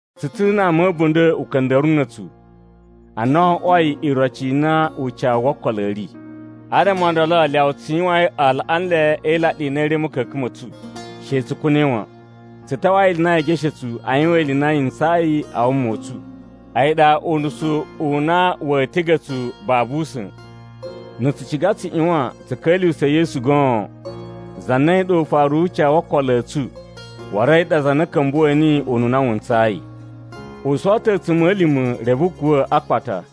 Tsu ta̱ na ama a̱bunda̱ uka̱nda̱ruwu na̱ a̱tsu a na o oꞌwoi iroci i na ucawu wo okolo u ri. Adama o ndolo lyawa tsu yuwain alaꞌanlai e ilaɗi a na a̱ ri a̱ ma̱ka̱ka̱n ma̱ tsu, she tsu kuna̱i wan. Tsu tawai ili i na yee geshe tsu a yuwan ili i na yi ntsayi a wuma u tsu, a̱yi ɗa, unusu u na wa̱a̱ tiga̱ tsu babu usa̱n. Na̱ tsu ciga tsu ꞌyuwan tsu ka̱lyuwusa̱ Yesu goon, za na a̱yi ɗa ufaru wu ucawu wo okolo a̱ tsu waru a̱yi ɗa za na ka̱mbuwa̱ niyi ununa wu ntsayi. U sowo ta̱ a̱tsuma̱lima̱ reve u kuwa̱ a akpata.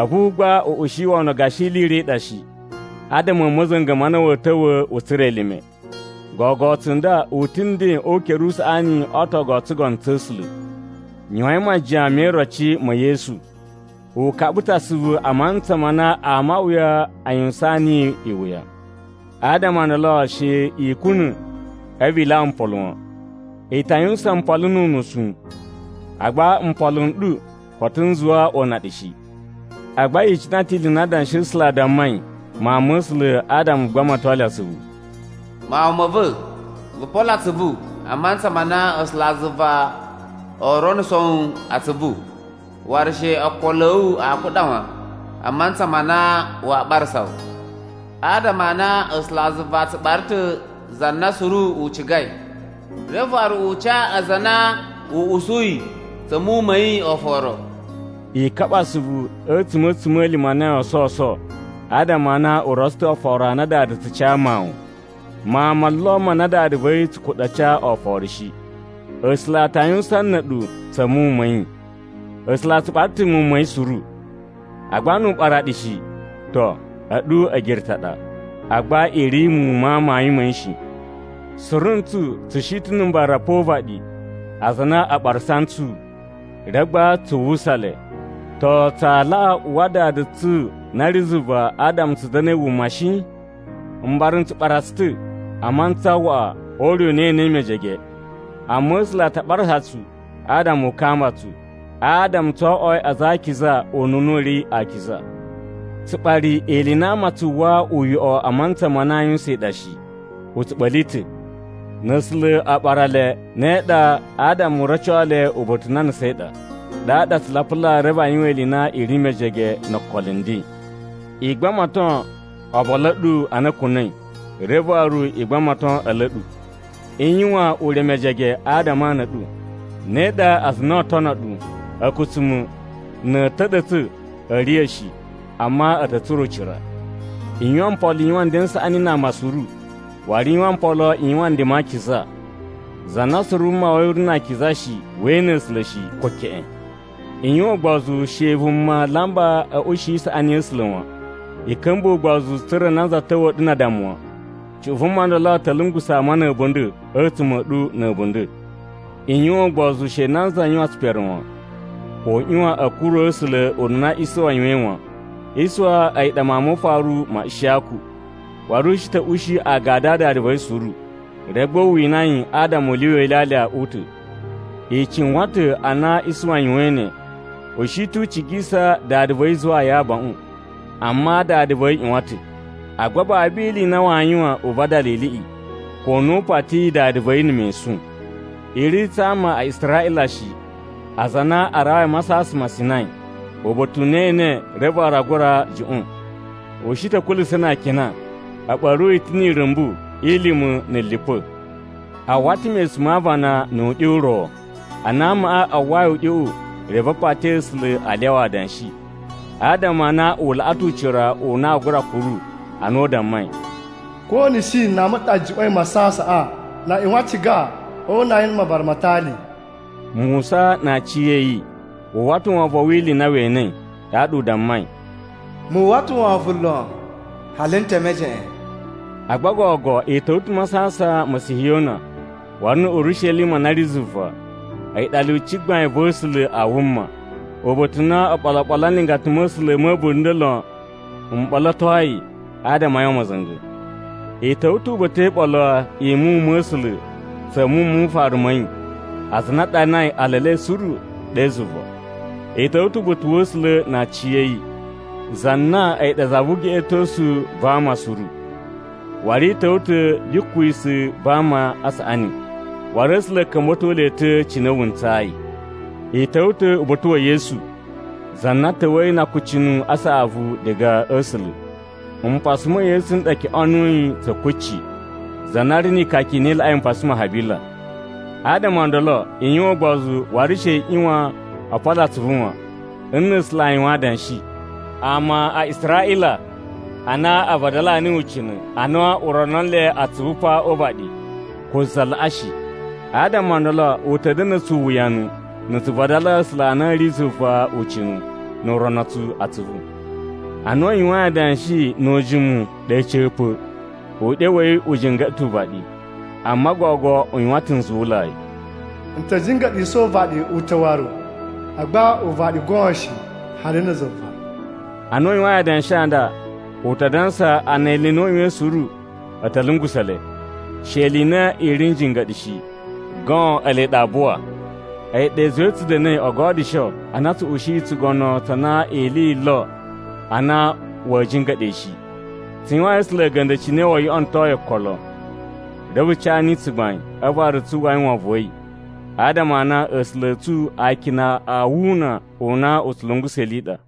A̱vu gba u ushi wono gashi ili i ro i ɗa shi, adama a̱ ma̱za̱nga̱ ma na wa̱a̱ ta̱wa̱ u tsura̱ elime. Gogo tsunda u ta̱ nden o ukere usaꞌani o ootogu o tsugono tsa̱ A̱sula̱. Yuwain majiyan me iroci ma̱ Yesu. U kaɓa ta̱ asuvu a mantsa ma na ama a wuya a yuwusaan yi iwuya. Adama o ndolo she i kuna̱ a̱vu i lyawa mpolo wan. I ta yuwusan mpolo nu unusu, agba mpolo n ɗu koto n zuwa o una ɗu shi. Agba yi icina ta̱ ili i na Adanshi a̱ A̱sula̱ a dammai muwun ma̱ A̱sula̱ adama u gbamato le asuvu: “Mawun ma̱ va̱, vu polo atsuvu a mantsa ma na A̱sulazuva oo ronuso wu atsuvu, waru she okolo a̱ wu a kuɗa wan a mantsa ma na waa ɓarasa wu. Adama a na A̱sulazuva a tsu ɓara ta̱ za na suru u cigai, reve waru u ca aza a na u usuyi tsa̱ muwun ma̱ yi oforo.” I kaɓa asuvu a̱tsuma̱ a̱tsuma̱lima̱ a na yoo sowuso adama a na u rotso ta̱ oforo a na dada tsu ca mawun. Mawun mo lo ma na dada va̱ yi tsu kuɗa̱ a ca oforo shi. A̱sula̱ a ta yuwusan na̱ a̱ɗu tsa̱ muwun ma̱ yi. A̱sula̱ a tsu ɓara ta̱ muwun ma̱ yi suru, agba nu u ɓara ɗu shi, to, a̱ɗu a̱girutu a ɗa, agba i ri muwun ma amayun ma̱ yi shi. Suru ntsu tsu shi ta̱ na̱ mbara pa o uvaɗi aza a na a ɓarasa ntsu. Reve gba tsu uwwusa le. To tsaa laꞌa uwwa Dada tsu na ri zuva adama tsu da̱na̱i wuma shi? Mbara n tsu ɓara tsu ta̱ a mantsa waꞌa o ure u na e enei mejege. Amma A̱sula̱ a ta ɓarasa tsu adama u kamba tsu, adama tso oꞌwoi aza a akiza ununa u ri akiza. Tsuɓari ili i na ama a tsu uwwa uyoꞌo a mantsa ma na aa yuwusan yi ɗa shi, u tsu ɓa̱li ta̱! Na̱ A̱sula̱ a ɓara le, ne ɗa, adama u roco le uba̱ta̱ u na a nusain ɗa, ɗaɗa a tsu lapula reve a yuwan ili i na i ri mejege no okolo nden. I gbamato obolu a̱ ɗu a na a̱ kuna̱i, reve waru i gbamato a̱lu a̱ ɗu. I yuwan ure mejege adama a ana a̱ ɗu. Ne ɗa aza a na oo tono ɗu a̱kutsuma̱, na̱ a̱ ta̱ɗa̱tsa̱, a̱a̱ riya̱ shi, amma a̱ ta̱ tsura̱ ucira. I yuwan mpolo i yuwan nden n saꞌani na ama suru, waru i yuwan mpolo i yuwan nden ma akiza. Za na suru wuma wa̱ yi u ri na akiza shi, wee ene A̱sula̱ shi, ko keꞌen. I yuwan ugbozu she vuma lamba a̱ ushi isaꞌani ya̱ A̱sula̱ wan. I ka̱mbuwa̱ ugbozu tsa̱ra̱ nanza ta̱wa̱a̱ ɗu na addama wan. Cuꞌun vuma ndolo ta̱ lungusa̱ ama na̱ a̱bunda̱ a̱tsuma̱ a̱ ɗu na̱ a̱bunda̱. I yuwan ugbozu she nanza yuwan tsipere wan, ko u ꞌyuwan a̱ kuru A̱sula̱ ununa Isuwa yuwain wan. Isuwa a̱yi ɗa mawun mo ufaru ma Ishiyaku, waru u shi ta̱ ushi agadu a dada va̱ yi suru, reve gba u wina yi adama u lyuwa ilyalya u ta̱. I cuwan ta̱ ana Isuwa yuwain ne, u shi ta̱ u cigisa dada va̱ yi zuwaa yi abaꞌun, amma dada va̱ yi ꞌyuwan ta̱. Agba babu ili i na waa yuwan u vadala iliꞌi, ko a na u patiyi dada va̱ yi na̱ mesun. I ri tsa ama a Israꞌila shi, aza a na a rawai a Masasan ma Sinai, uba̱ta̱ u na ee ene reve waru aa gura juꞌwa̱n. U shi ta̱ a̱ kulusa̱ na akina, a̱ ɓa̱ru yi ta̱ ni irumbu i lima̱ na̱ lipa̱. A uwwa ta̱ mesun ma aavana nu uɗyo u ro. Ana amaꞌa a uwwai uɗyoꞌo, reve a pati A̱sula̱ a lyawa adanshi, adama a na u laꞌa ta̱ ucira u na aa gura kuru ana u dammai, “Ko na̱ shi nama ɗa juꞌwa̱in masasaꞌan, na a ꞌyuwan a ciga o una yi na̱ mavara ma atali.” Musa na aciya̱yi wu uwwa ta̱ wovon wi ili i na we enei ɗaɗa u dammai, “Mu uwwa ta̱ wovon lon hali n te mejeꞌen.” Agba gogo i ta̱wa̱ ta̱ a Masasan ma̱ Sihiyona waru na̱ Urishelima na ri zuva. A̱yi ɗa lyuci gbain va̱ A̱sula̱ a wuma, uba̱ta̱ u na oɓolo oɓolo a nlingata ma̱ A̱sula̱ ma̱ a̱bunda̱ lon m ɓolotoi adama a yuwan ma̱za̱nga̱. I ta̱wa̱ ta̱ uba̱ta̱ e iɓolo i muwun ma̱ A̱sula̱ tsa̱ muwun mu ufaru ma̱ yi aza a na a ɗanai ala e le suru ɗe zuva. I ta̱wa̱ ta̱ uba̱ta̱ wa̱ A̱sula̱ na aciya̱yi, za na a̱yi ɗa za vu ugeꞌetosu va ama suru. Waru i ta̱wa̱ ta̱ ya̱ kwisa̱ va ama a saꞌani, waru A̱sula̱ a̱ ka̱mba̱to le ta̱ cine wu ntsayi. I ta̱wa̱ ta̱ uba̱ta̱ wa̱ Yesu, za na ta̱wa̱yi na akucunu a saꞌavu diga a̱ A̱sula̱. Mpasa ma̱ Yesu n ɗa o kyoꞌonuyi tsa̱ kucci, za na ri ni ikaka i na i laꞌai mpasa ma Habila. Adama o ndolo i yuwan ugbozu waru she i ꞌyuwan o polo atsuvu wan, n na̱ A̱sula̱ a yuwan adanshi. Ama a Israꞌila a na a vadalaa niyi ucina̱ ana u o rono nle atsuvu pa o uvaɗi, ko za laꞌa shi. Adama o ndolo u ta̱ da̱na̱ tsu uwuyanu na̱ tsu vadalaa A̱sula̱ a na a̱ ri zuva ucina̱ nu u rono tsu atsuvu. Ana u yuwain adanshi nu ujimu ɗe a̱ca̱pa̱, uɗyo wa̱ yi u jinga̱ɗa̱ ta̱ uvaɗi, amma gogo u yuwan ta̱ nzuwulai, “N ta̱ jinga̱ɗisa̱ uvaɗi u ta̱ waru, agba uvaɗi goon shi, hali na̱ zuva.” Ana u yuwain adanshi a nda, u ta dansa a na ili i na u yuwain suru a̱ ta̱ lungusa̱ le. She ili i na i ri n jinga̱ɗa̱ shi, goon ele ɗa aa buwa. A̱yi ɗa i zuwai tsu da̱na̱i o godyusho a na tsu ushiyi tsugono tsa na ili yi lo a na wa̱a̱ jinga̱ɗa̱ yi shi. Tsu yuwayin A̱sula̱ a̱ga̱nda̱ cine woo yoꞌonoto yi okolo, reve tsu ca niyi tsugbain a̱vu waru tsu uwwai wovon wa̱ yi, adama a na A̱sula̱ a̱ tsu akina a wuna u na u tsu lungusa̱ ili i ɗa.